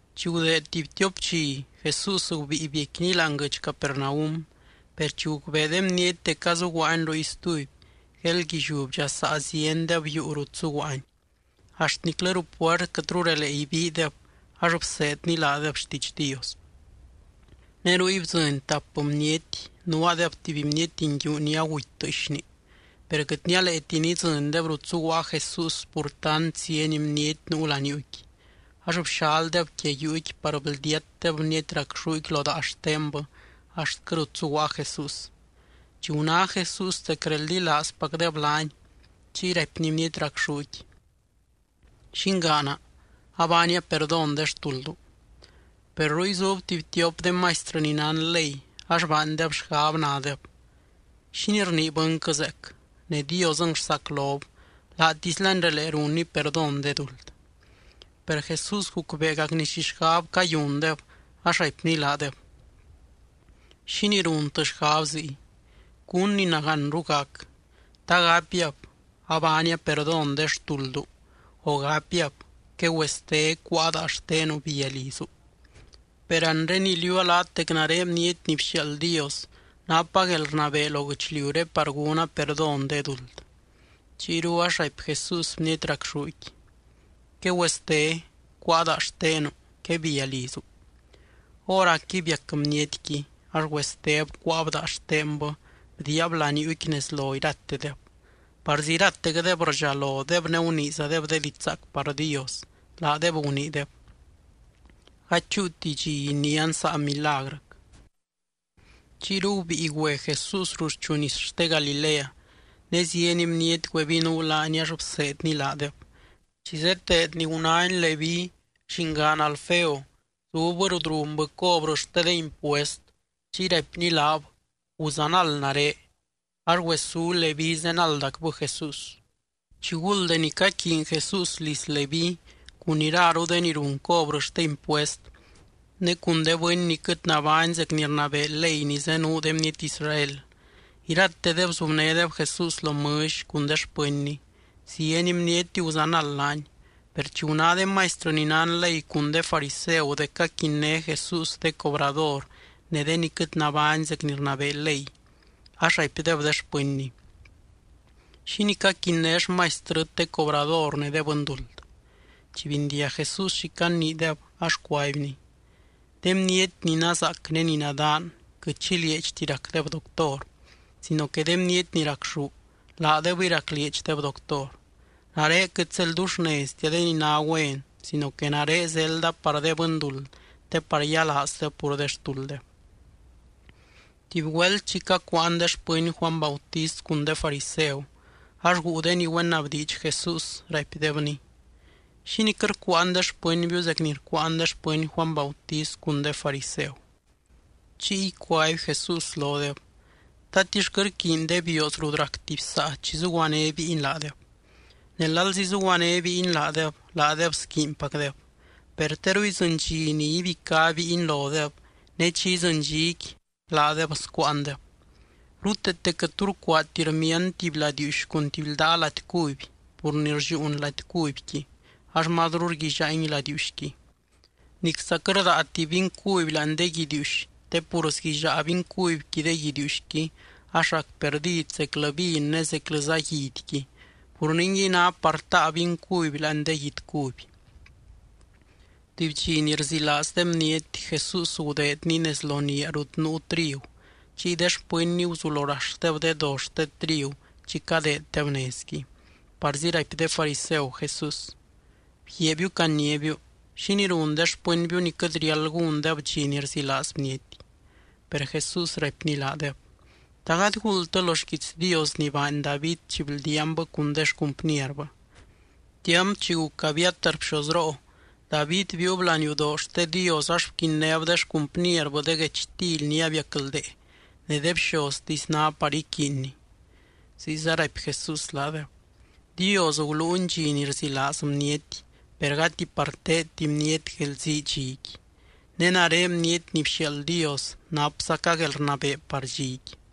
Chi gudeed tuby tiop dxi, Jesús gubíi biecquiny láani guɨdx Capernaum. Per chi gucbee de bniety dec azuguaany ruy stuby, gueeldguilliú bdxasaa ziendeb yuu rut zuguaany, axt niclɨ ruu puert quɨtru relee ibiideb ax bseedny laadeb xtiidx Dios. Ne ruy bdzɨny tap bniety, nuaadeb tuby bniety nguiu ni aguty tɨɨxni. Per quɨt nialeeti nidzɨndeb rut zuguaa Jesús pur tant zieny bniety nuu laniuuqui, ax bxaldeb quia yuuqui par bldiatdeb bniety racxúqui lo daa xtenbɨ axtquɨ rut zuguaa Jesús. Chi guná Jesús dec reldilaazpacdeb laany, chiy raipny bniety racxúqui: —Llingaana, abaania perdón de xtuldu. Per ruy zub tuby tiop de maistrɨ ni nán ley ax baandeb xgab, nadeb: “¿Xínii rnii bɨnquɨ zeec? Ne Diosɨng rsaclob, laatislany relee runny perdón de duld.” Per Jesús gucbeegacny xi xgab cayundeb ax raipny laadeb: —¿Xínii runtɨ xgab ziy? ¿Cún ni nagánru gac? ¿Ta gapiab: “Abaania perdón de xtuldu”, o gapiab: “Quegüeste, cuáa daa xtenu, bia lizu”? Per anre iliuua laat dec nare Bniety ni bxiaald Dios napa guelrnabee lo guɨchliuré par gúna perdón de duld. Chiyru ax raipy Jesús bniety racxúqui: —Quegüeste, cuáa daa xtenu, quebia lizu. Hóracqui biac bnietqui. Ax güesteb cuáab daa xtenbɨ bdiiab laniuuqui nez lo iratedeb. Parzi iratecdeb rdxalodeb ne guniizadeb de diidx zaac par Dios, laadeb guniideb: —Gady chúuti dxi inián saa milagrɨc. Chiyru gubíi güe Jesús ruxchu nis xte Galilea. Ne zieny bniety güebinuu laany ax bseedny laadeb. Chi zeteedny, gunány Leví llingaan Alfeo zubbɨ rut runbɨ cobrɨ xte de impuest. Chiy raipny laab: —Guzanald nare. Ax güesú Leví zenaldacbɨ Jesús. Chiguld deni caquiiny Jesús liz Leví cun iraru de ni run cobrɨ xte impuest, ne cun de bɨny ni quɨt nabány zec ni rnabee ley ni zenuu de bniety Israel, iratedeb zubnédeb Jesús lo mɨlly cun de xpɨnny. Zieny bniety guzanald laany. Per chi guná de maistrɨ ni nán ley cun de fariseu dec caquinné Jesús de cobrador ne de ni quɨt nabány zec ni rnabee ley, ax raipdeb de xpɨnny: —¿Xínii caquinné xmaistrɨt de cobrador ne de bɨnduld? Chi bindiag Jesús xi caniideb ax cuaibny: —De bniety ni nazaac ne ni nadaan quɨt xi lieedxti racdeb doctor, sino que de bniety ni racxú laadebɨy raclieedxdeb doctor. Nare quɨt zedldullneztia de ni ná güen sino que nare zelda par de bɨnduld te par yialaazdeb pur de xtulddeb. Tuby güelt chi cacuuan de xpɨny Juany Bautist cun de fariseu, ax guu de ni güenabdiidx Jesús, raipdebny: —¿Xínii quɨt rcuuan de xpɨnbiu zec ni rcuuan de xpɨny Juany Bautist cun de fariseu? Chiy cuaby Jesús lodeb: —¿Tatix quɨt rquiiny de bioos rut rac tuby saa chi zuguané bíiny laadeb? Ne lalzi zuguané bíiny laadeb, laadeb squiinpacdeb. Per teru idzɨny dxi ni ibicá bíiny lodeb, ne chi idzɨny dxiqui, laadeb scuuandeb. ’Ruteete quɨt tu rcuaati rmiand tuby ladiiuxy cun tuby ldaa lady cuby pur ni rlliuun lady cubyqui, ax mazru rguillaangui ladiiuxqui. Nicza quɨt rdaati vin cuby láani de guidiiuxy te pur sguillaa vin cubyqui de guidiiuxqui, ax rac perdid zeclɨ vin ne zeclɨza guidyqui. Pur ningui, ná par taa vin cuby láani de guidy cuby. Tuby dxi ni rzilaaz de bniety, Jesús gudeedny nez lo niaa rut nuu trigu. Chiy de xpɨnny guzulo raxdeb de do xte trigu chi cadeeddeb nezqui. Parzi raipy de fariseu Jesús: —Bguiaabiu caniábiu, ¿xínii run de xpɨnbiu ni quɨt riáld gúndeb dxi ni rzilaaz bniety? Per Jesús raipny laadeb: —¿Ta gady guuldtɨ lo xquiits Dios ni baany David chi bldiaanbɨ cun de xcumpnierbɨ? Tiamp chi guc Abiatar bxozroo, David biiub laniudoo xte Dios ax bquinnéb de xcumpnierbɨ de guechtily ni abiacldee ne de bxoztisy ná par iquiinni. Ziyza raipy Jesús laadeb: —Dios guluuny dxi ni rzilaaz bniety, per gati par teedti bniety guelzii dxiqui. Ne nare Bniety ni bxiaald Dios napzaca guelrnabee par dxiqui.